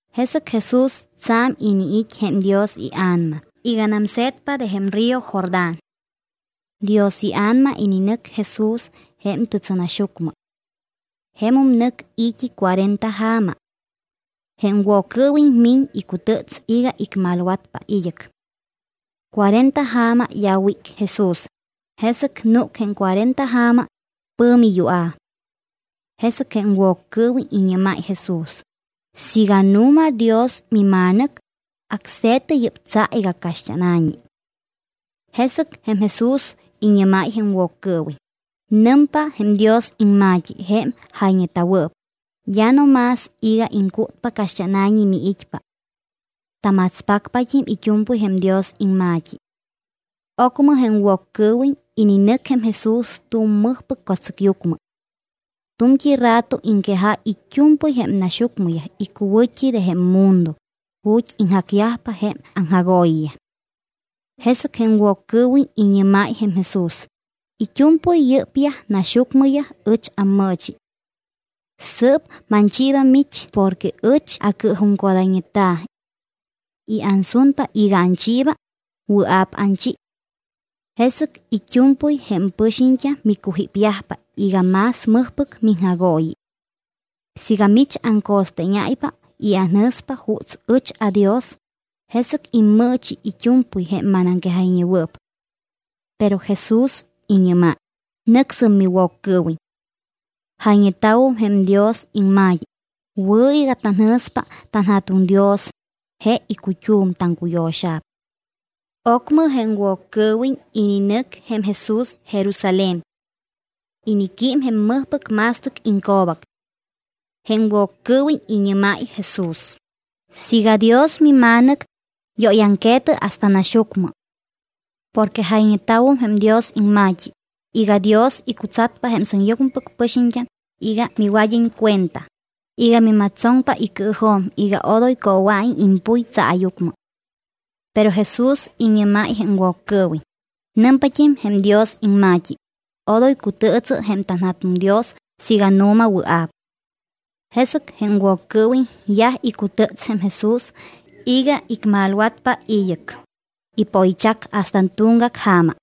Jesɨc Jesús tsa̱m iniit́ jém Dios iA̱nama iganam se̱tpa de jém río Jordán. Dios iA̱nama ininɨc Jesús jém tɨtsɨnaxyucmɨ. Jemum nɨc i̱t́i cuarenta ja̱ma. Jém Woccɨɨwiñ miñ icutɨts iga icmalwatpa id́ɨc. Cuarenta ja̱ma d́a wíc Jesús, jesɨc núc jém cuarenta ja̱ma, pɨ̱mi yua̱. Jesɨc jém Woccɨɨwiñ iñɨ́máy Jesús: —Siiga nu̱ma Dios mima̱nɨc, acse̱tɨ yɨ́p tsa iga caxt́ána̱ñi. Jesɨc jém Jesús iñɨ́máy jém Woccɨɨwiñ: —Nɨmpa jém Dios iŋma̱t́i, jém jayñeta̱wɨɨp: “D́a no más iga iŋcútpa caxt́ána̱ñi miit́pa. Tamatspacpat́im it́u̱mpɨy jém Dios iŋma̱t́i.” Ocmɨ jém Woccɨɨwiñ ininɨc jém Jesús tu̱m mɨjpɨc co̱tsɨcyucmɨ. Tu̱mt́i rato iŋquejáy it́u̱mpɨy jém naxyucmɨyaj icuwɨ̱t́i de jém mundo ju̱t́ iŋjacyajpa jém aŋjagooyiyaj. Jesɨc jém Woccɨɨwiñ iñɨ́máy jém Jesús: —It́u̱mpɨy yɨ́pyaj naxyucmɨyaj ɨch ammɨɨchi. Sɨɨp manchiiba mich porque ɨch acɨɨjuŋcodayñeta̱. I̱ ansunpa iga anchiiba, wɨa̱p anchi. Jesɨc it́u̱mpɨy jém pɨxiñt́am micujípyajpa iga más mɨjpɨc miŋjagooyi. Siiga mich aŋco̱steeñáypa y anjɨ̱spa juuts ɨch adios, jesɨc immɨɨchi it́u̱mpɨy jém manaŋquejayñewɨɨp. Pero Jesús iñɨ́máy: —Nɨcsɨm, miWoccɨɨwiñ. Jayñeta̱wum jém Dios iŋma̱t́i: “Wɨ̱ iga tanjɨ̱spa tanJa̱tuŋ Dios, je icut́um taŋcuyo̱xa̱p.” Ocmɨ jém Woccɨɨwiñ ininɨc jém Jesús Jerusalén. Iniquím jém mɨjpɨc ma̱stɨc iŋco̱bac. Jém Woccɨɨwiñ iñɨ́máy Jesús: —Siiga Dios mima̱nɨc, yóyaŋque̱tɨ hasta naxyucmɨ. Porque jayñeta̱wum jém Dios iŋma̱t́i iga: Dios icutsatpa jém sɨŋyucmɨpɨc pɨxiñt́am iga miwad́iñ cuenta iga mimatstsoŋpa icɨɨjo̱m iga odoy coowa̱iñ impuy tsaayucmɨ. Pero Jesús iñɨ́máy jém Woccɨɨwiñ: —Nɨmpat́im jém Dios iŋma̱t́i: “Odoy cutɨɨtsɨ jém tanJa̱tuŋ Dios siiga nu̱ma wɨa̱p.” Jesɨc jém Woccɨɨwiñ yaj icutɨts jém Jesús iga icmalwatpa id́ɨc. Ipoychac hasta tuŋgac ja̱ma.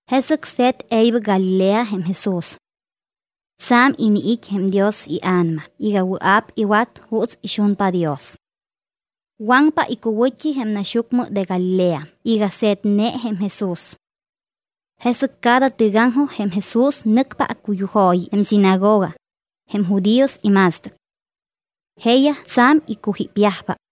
Jesɨc se̱t e̱ybɨc Galilea jém Jesús. Tsa̱m iniit́ jém Dios iA̱nama iga wɨa̱p iwat juuts ixunpa Dios. Waŋpa icuwɨ̱t́i jém naxyucmɨ de Galilea iga se̱tne jém Jesús. Jesɨc cada tɨgaŋjoj jém Jesús nɨcpa accuyujooyi jém sinagoga, jém judíos ima̱stɨc. Jeeyaj tsa̱m icujípyajpa.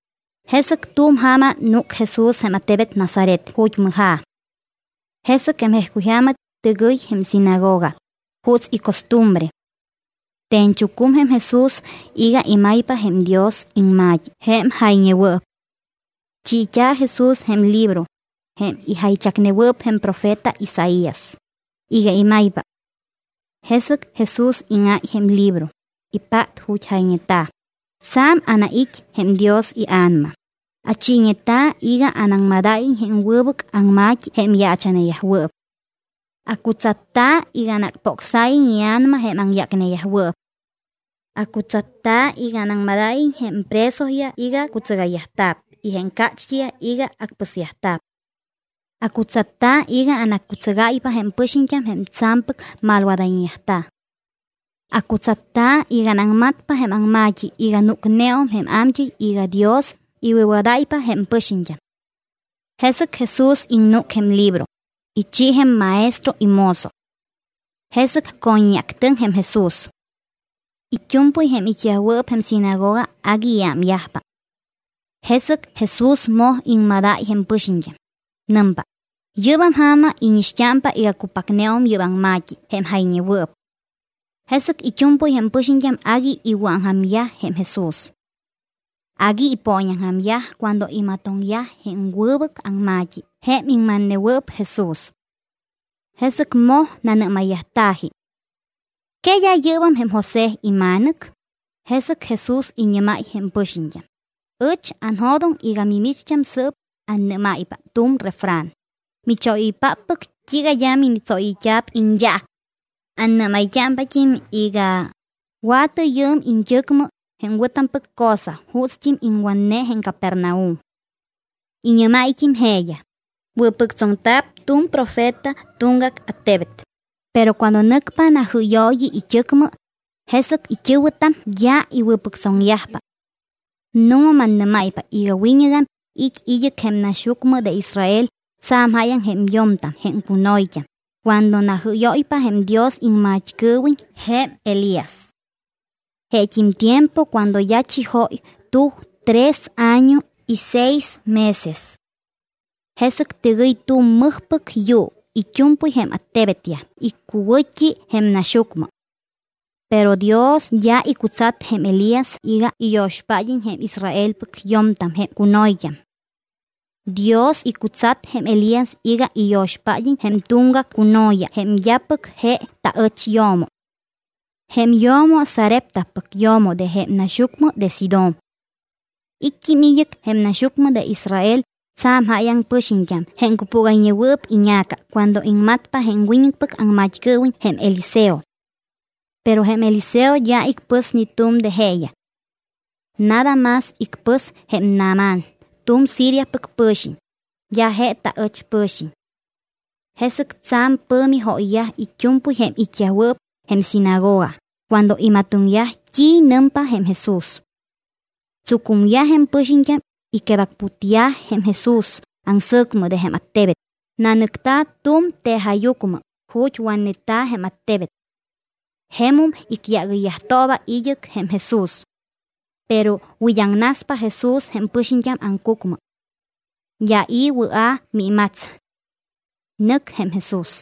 Jesɨc tu̱m ja̱ma núc Jesús jém attebet Nazaret ju̱t́ mɨja̱. Jesɨc jém jejcuyja̱ma, tɨgɨy jém sinagoga juuts icostumbre. Te̱ñchucum jém Jesús iga imaypa jém Dios iŋma̱t́i jém jayñewɨɨp. Chiit́a̱ Jesús jém libro, jém ijaychacnewɨɨp jém profeta Isaías, iga imaypa. Jesɨc Jesús íŋáy jém libro, ipát ju̱t́ jayñeta̱: Tsa̱m anait́ jém Dios iA̱nama, achiiñeta̱ iga anaŋmadáyiñ jém wɨbɨc aŋma̱t́i jém yaacha̱neyajwɨɨp. Acutsatta̱ iga anacpocsáyiñ ia̱nama jém aŋyácneyajwɨɨp. Acutsatta̱ iga anaŋmadáyiñ jém presoyaj iga cutsɨgayyajta̱p y jém cácht́iyaj iga acpɨsyajta̱p. Acutsatta̱ iga anaccutsɨgáypa jém pɨxiñt́am jém tsa̱mpɨc malwadayñeyajta̱. Acutsatta̱ iga anaŋmatpa jém aŋma̱t́i iga núcneum jém a̱mt́ɨy iga Dios iwɨ̱wadáypa jém pɨxiñt́am. Jesɨc Jesús iŋnúc jém libro, ichi jém maestro imozo. Jesɨc co̱ññeactɨŋ jém Jesús. It́u̱mpɨy jém it́yajwɨɨp jém sinagoga agui iámyajpa. Jesɨc Jesús moj iŋmadáy jém pɨxiñt́am. Nɨmpa: —Yɨ́bam ja̱ma íñixt́ámpa iga cupacneum yɨ́p aŋma̱t́i jém jayñewɨɨp. Jesɨc it́u̱mpɨy jém pɨxiñt́am agui iwɨ̱aŋja̱myaj jém Jesús. Agui ipooñaŋja̱myaj cuando imatoŋyaj jém wɨbɨc aŋma̱t́i jém iŋmatnewɨɨp Jesús. Jesɨc moj nanɨ́mayyajta̱ji: —¿Que d́a yɨ́bam jém José ima̱nɨc? Jesɨc Jesús iñɨ́máy jém pɨxiñt́am: —Ɨch anjo̱doŋ iga mimicht́am sɨ́p annɨ́máypa tu̱m refran: “¿Michóyɨ́yoypáppɨc t́iiga d́a minitsóyɨyt́a̱p iñyaac?” Annɨ́mayt́ámpat́im iga: “Wa̱tɨ yɨɨm iñt́ɨcmɨ jém wɨ̱tampɨc cosa juutst́im iŋwatne jém Capernaum.” Iñɨ́máyt́im jeeyaj: —Wɨ̱pɨctsoŋta̱p tu̱m profeta tuŋgac attebet, pero cuando nɨcpa najɨ́yooyi it́ɨcmɨ, jesɨc jém it́ɨ̱wɨtam d́a iwɨ̱pɨctsoŋyajpa. Nu̱ma, mannɨ́máypa iga wiñɨgam it́ id́ɨc jém naxyucmɨ de Israel tsa̱m jáyaŋ jém yo̱mtam jém cuno̱yt́am cuando najɨ́yóypa jém Dios iŋmat́cɨɨwiñ jém Elías. Jeet́im tiempo cuando d́a chijóy tuj tres año y seis meses. Jesɨc tɨgɨy tu̱m mɨjpɨc yuu it́u̱mpɨy jém attebetyaj icuwɨ̱t́i jém naxyucmɨ. Pero Dios d́a icutsat jém Elías iga iyo̱xpád́iñ jém Israelpɨc yo̱mtam jém cuno̱yt́am. Dios icutsat jém Elías iga iyo̱xpád́iñ jém tuŋgac cuno̱ya jém d́apɨc je taɨch yo̱mo. Jém yo̱mo Sareptapɨc yo̱mo de jém naxyucmɨ de Sidón. It́t́im id́ɨc jém naxyucmɨ de Israel tsa̱m jáyaŋ pɨxiñt́am jém cupúgayñewɨɨp iña̱ca cuando iŋmatpa jém wiñɨcpɨc aŋmat́cɨɨwiñ jém Eliseo. Pero jém Eliseo d́a icpɨs ni tu̱m de jeeyaj. Nada más icpɨs jém Naamán tu̱m Siriapɨc pɨ̱xiñ, d́a je taɨch pɨ̱xiñ. Jesɨc tsa̱m pɨ̱mi jóyyaj it́u̱mpɨy jém it́yajwɨɨp jém sinagoga cuando imatoŋyaj t́i nɨmpa jém Jesús. Tsucumyaj jém pɨxiñt́am, iquebacputyaj jém Jesús aŋsɨ̱cmɨ de jém attebet, nanɨcta̱ tu̱m tejajyucmɨ ju̱t́ watneta̱ jém attebet. Jemum icyágɨyyajtooba id́ɨc jém Jesús. Pero wid́aŋnaspa Jesús jém pɨxiñt́am aŋcucmɨ. D́a i̱ wɨa̱ miimats. Nɨc jém Jesús.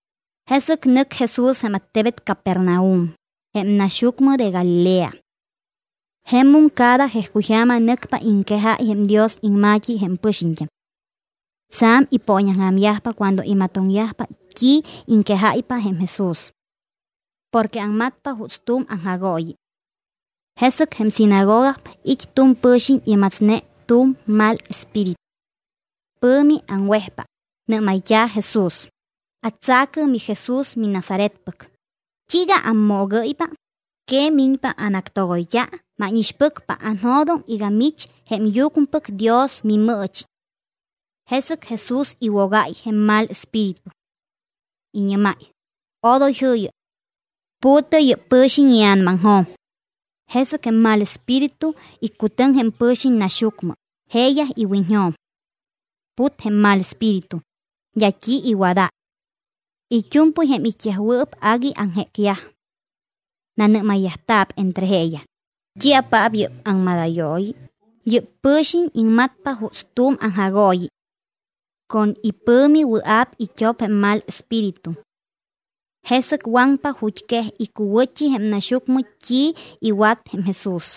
Jesɨc nɨc Jesús jém attebet Capernaum, jém naxyucmɨ de Galilea. Jemum cada jejcuyja̱ma nɨcpa iŋquejáy jém Dios iŋma̱t́i jém pɨxiñt́am. Tsa̱m ipooñaŋja̱myajpa cuando imatoŋyajpa t́i iŋquejáypa jém Jesús. Porque aŋmatpa juuts tu̱m aŋjagooyi. Jesɨc jém sinagoga it́ tu̱m pɨ̱xiñ imatsne tu̱m mal espíritu. Pɨ̱mi aŋwejpa, nɨ́mayt́a̱ Jesús: —Atsa̱cɨ, miJesús miNazaretpɨc, ¿t́iiga ammoogɨ́ypa? ¿Que miñpa anactogoyt́a? Mánixpɨcpa, anjo̱doŋ iga mich jém Yucmɨpɨc Dios miMɨɨchi. Jesɨc Jesús iwogáy jém mal espíritu. Iñɨ́máy: —Odoy jɨ̱yɨ. Pu̱tɨ yɨ́p pɨ̱xiñ ia̱namaŋjo̱m. Jesɨc jém mal espíritu iccutɨŋ jém pɨ̱xiñ naxyucmɨ jeeyaj iwiñjo̱m. Put jém mal espíritu, d́a t́i iwadáy. It́u̱mpɨy jém it́yajwɨɨp agui aŋjécyaj. Nanɨ́mayyajta̱p entre jeeyaj: —¿T́iapaap yɨ́p aŋmadayooyi? Yɨ́p pɨ̱xiñ iŋmatpa juuts tu̱m aŋjagooyi. Con ipɨ̱mi wɨa̱p it́op jém mal espíritu. Jesɨc waŋpa ju̱t́ quej icuwɨ̱t́i jém naxyucmɨ t́i iwat jém Jesús.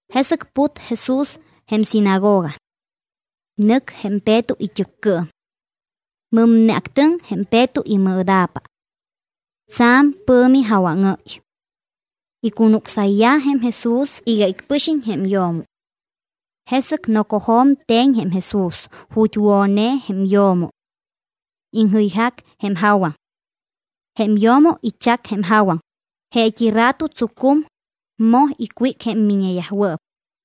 Jesɨc put Jesús jém sinagoga. Nɨc jém Peto it́ɨccɨɨm. Mɨmne actɨŋ jém Peto imɨɨda̱pa. Tsa̱m pɨ̱mi jawaŋɨ́y. Icunucsayyaj jém Jesús iga icpɨxiñ jém yo̱mo. Jesɨc nocojo̱m te̱ñ jém Jesús ju̱t́ wo̱ne jém yo̱mo. Iŋjɨyjac jém jawaŋ. Jém yo̱mo ichac jém jawaŋ, jeet́i rato tsucum, moj icwíc jém miññeyajwɨɨp.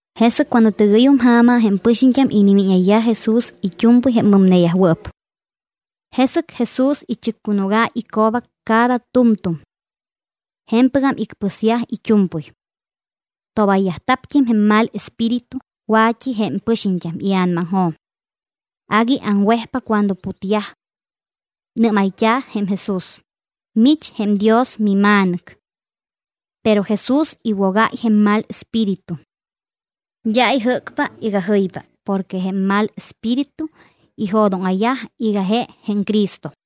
Jesɨc cuando tɨgɨ́yum ja̱ma, jém pɨxiñt́am inimíñayyaj Jesús it́u̱mpɨy jém mɨmneyajwɨɨp. Jesɨc Jesús ichɨccunúgáy ico̱bac cada tu̱mtu̱m. Je̱mpɨgam icpɨsyaj it́u̱mpɨy. Tobayyajta̱pt́im jém mal espíritu wa̱t́i jém pɨxiñt́am ia̱namaŋjo̱m. Agui aŋwejpa cuando putyaj. Nɨ́mayt́a̱ jém Jesús: —Mich jém Dios miMa̱nɨc. Pero Jesús iwogáy jém mal espíritu. D́a ijɨ́cpa iga jɨypa porque jém mal espíritu ijo̱dóŋa̱yaj iga je jém Cristo.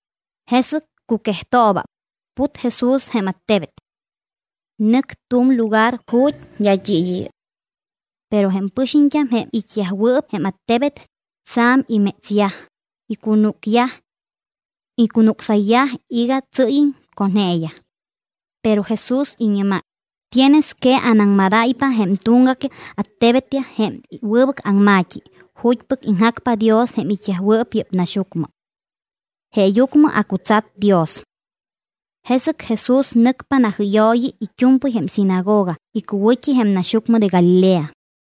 Jesɨc cuquejtooba, put Jesús jém attebet. Nɨc tu̱m lugar ju̱t́ d́a t́i id́ɨ́yɨ́y. Pero jém pɨxiñt́am, jém it́yajwɨɨp jém attebet, tsa̱m imétsyaj, icunúcyaj. Icunucsayyaj iga tsɨ́yiñ con jeeyaj. Pero Jesús iñɨ́máy: —Tienes que anaŋmadáypa jém tuŋgac attebetyaj jém wɨbɨc aŋma̱t́i ju̱t́pɨc iŋjacpa Dios jém it́yajwɨɨp yɨ́p naxyucmɨ. Jeeyucmɨ acutsat Dios. Jesɨc Jesús nɨcpa najɨ́yooyi it́u̱mpɨy jém sinagoga icuwɨ̱t́i jém naxyucmɨ de Galilea.